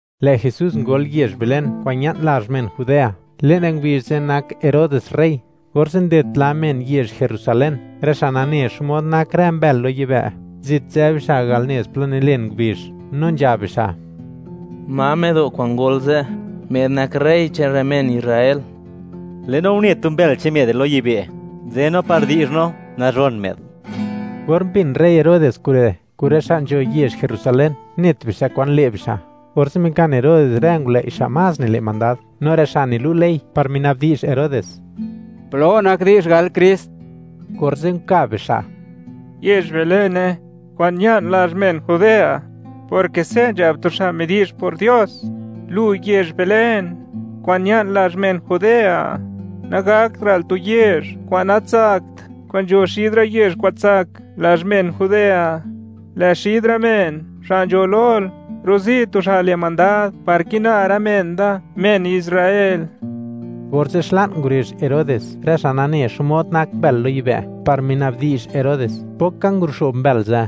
Lë' Jesús ngol yezh Belén kwa'n ña'n lazh men Judea; le'n rë ngubizh ze' nak Herodes rey. Orze' nded pla men yezh Jerusalén, rë xa' nane xmod nak rë mbël lo yibë', zit nzë bixa' al nez plo nilen ngubizh, no nzhab bixa': ―¿Ma më'do' kwa'n ngol ze', më'd nak rey che'n rë men Israel? Lë'no une tu mbël che'n më'd re' lo yibë'. Nzë no par di'zh no nazhon më'd. Or mbin rey Herodes kure' kun rë xa' nzho yezh Jerusalén, net bixa' kwan le' bixa'. Orze' mikan Herodes rë ngulëi' xa' más nile' mandad, no rë xa' nilu' ley par minabdi'zh Herodes: —¿Plo nak di'zh, gal Krist? Orze' nkab bixa': ―Yezh Belene, kwa'n ña'n lazh men Judea, porke se' nzhab tu xa' midi'zh por Dios: Lu, yezh Belén, kwa'n ña'n lazh men Judea, nagaktra'l tu yezh kwa'n natsakt kwa'n nzho xid rë yezh kwa'n tsak lazh men Judea, lë' xid rë men xa' nzho lol, rozi' tu xa' le' mandad, par kina rë men da, men Israel. Orze' xla'n ngurezh Herodes rë xa' nane xmod nak mbël lo yibë', par minabdi'zh Herodes, pok ka nguluxo'b mbël ze',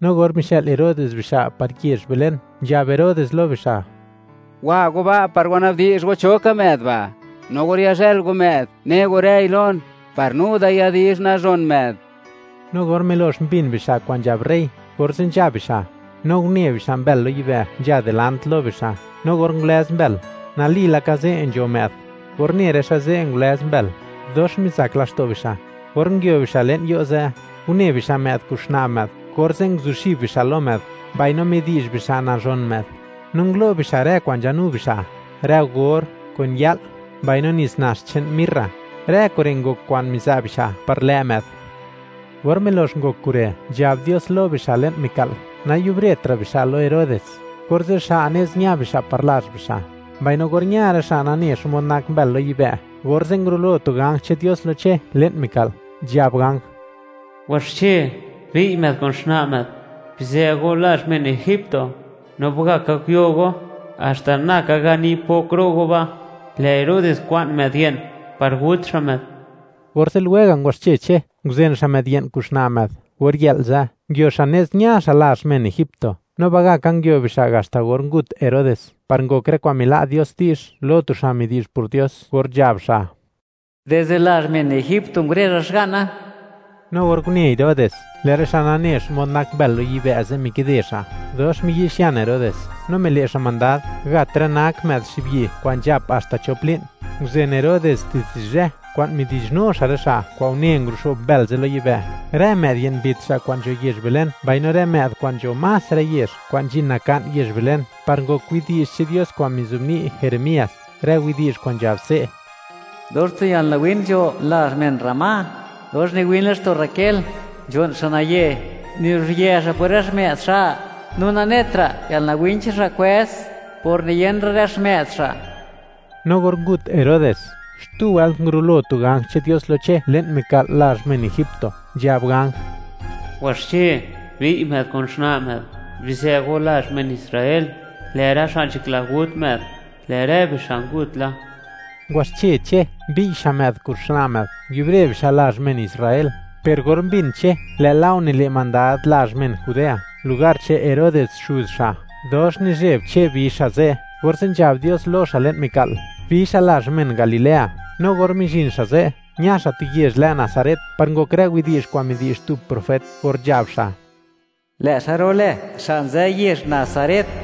no or mixë'l Herodes bixa' par yezh Belén, nzhab Herodes lo bixa': ―Wa go ba' par wanabdi'zh go cho ka më'd ba'. No or yazhël go më'd, ne go rëi lon, par nu da yadi'zh nazhon më'd. No or milox mbin bixa' kwa'n nzhab rey, orze' nzha bixa'. No une bixa' mbël lo yibë' nzha dilant lo bixa'; no or ngulëz mbël, nali laka ze' nzho më'd. Or une rë xa' ze' ngulëz mbël, dox mizak laxto' bixa'. Or nguio bixa' le'n yo' ze', une bixa' më'd kun xna' më'd, orze' nguzuxib bixa' lo më'd mbaino midi'zh bixa' nazhon më'd. No ngulo' bixa' rë kwa'n nzhanu bixa', rë or, kun ya'l, mbaino nits nax che'n mirra. Rë kure' ngok kwa'n miza' bixa' par lë' më'd. Or milox ngok kure', nzhab Dios lo bixa' le'n mika'l, nayubretra' bixa' lo Herodes. Orze' xa' nez ña bixa' par lazh bixa'. Mbaino or ña rë xa' nane xmod nak mbël lo yibë', orze' ngurulo tu ganj che'n Dios lo Che le'n mika'l, nzhab ganj: ―Waxche, bi'y më'd kun xna' më'd, bizë go lazh men egipto, no ba'gaka guyo go haxta na ka gani pok ro' go ba'; lë' Herodes kwa'n më'd ye'n par gut xa' më'd. Orze' lwega' ngwaxche Che, nguzen xa' më'd ye'n kun xna' më'd or yë'l ze', nguio xa' nez, ña xa' lazh men egipto, no ba'gaka nguio bixa' haxta or ngut Herodes, par ngok rë kwa'n mila' Dios di'zh lo tu xa' midi'zh por Dios or nzhab xa': “Dizde lazh men egipto ngurezha Xga'na.” No or une Herodes, lë' rë xa' nane xmod nak mbël lo yibë' ze' mikide xa', dox miyi'xian Herodes, no mile' xa' mandad, gat rë nak më'd xibyi' kwa'n nzhap haxta chop li'n. Nguzen Herodes dizde zhë kwa'n midi'zhnu xa' rë xa' kwa'n une nguluxo'b mbël ze' lo yibë'; rë më'd ye'n mbit xa' kwa'n nzho yezh Belén mbaino rë më'd kwa'n nzho más rë yezh kwa'n nzhin naka'n yezh Belén, par ngok widi'zh che'n Dios kwa'n mizobni' Jeremías, rë widi'zh kwa'n nzhab se': Dox tu yalnawin nzho lazh men Ramá, dox niwin laxto' Raquel, nzho'n xa' naye; nibizhyë xa' por rë xmë'd xa', no nanetra' yalnawin che'n xa' kwëz, por niyen ra' rë xmë'd xa'. No or ngut Herodes, xtu wëlt ngurulo tu ganj che'n Dios lo Che le'n mika'l lazh men egipto, nzhab ganj: ―Waxche, bi'y më'd kun xna' më'd; bizë go lazh men Israel; lë' rë xa' nzhakla gut më'd, lë' rë bixa' ngut la. Ngwaxche Che, mbi'y xa' më'd kun xna' më'd, nguiubre bixa' lazh men Israel. Per or mbin Che, lë' Lao nile' mandad lazh men Judea lugar che'n Herodes xuz xa', dox nizheb Che bi xa' ze'; orze' nzhab Dios lo xa' le'n mika'l, bi xa' lazh men Galilea, no or mizhin xa' ze', ña xa' tu yezh lë Nazaret, par ngok rë widi'zh kwa'n midi'zh tu profet or nzhab xa': “Lë' xa' ru'lë xa' nzë yezh Nazaret.”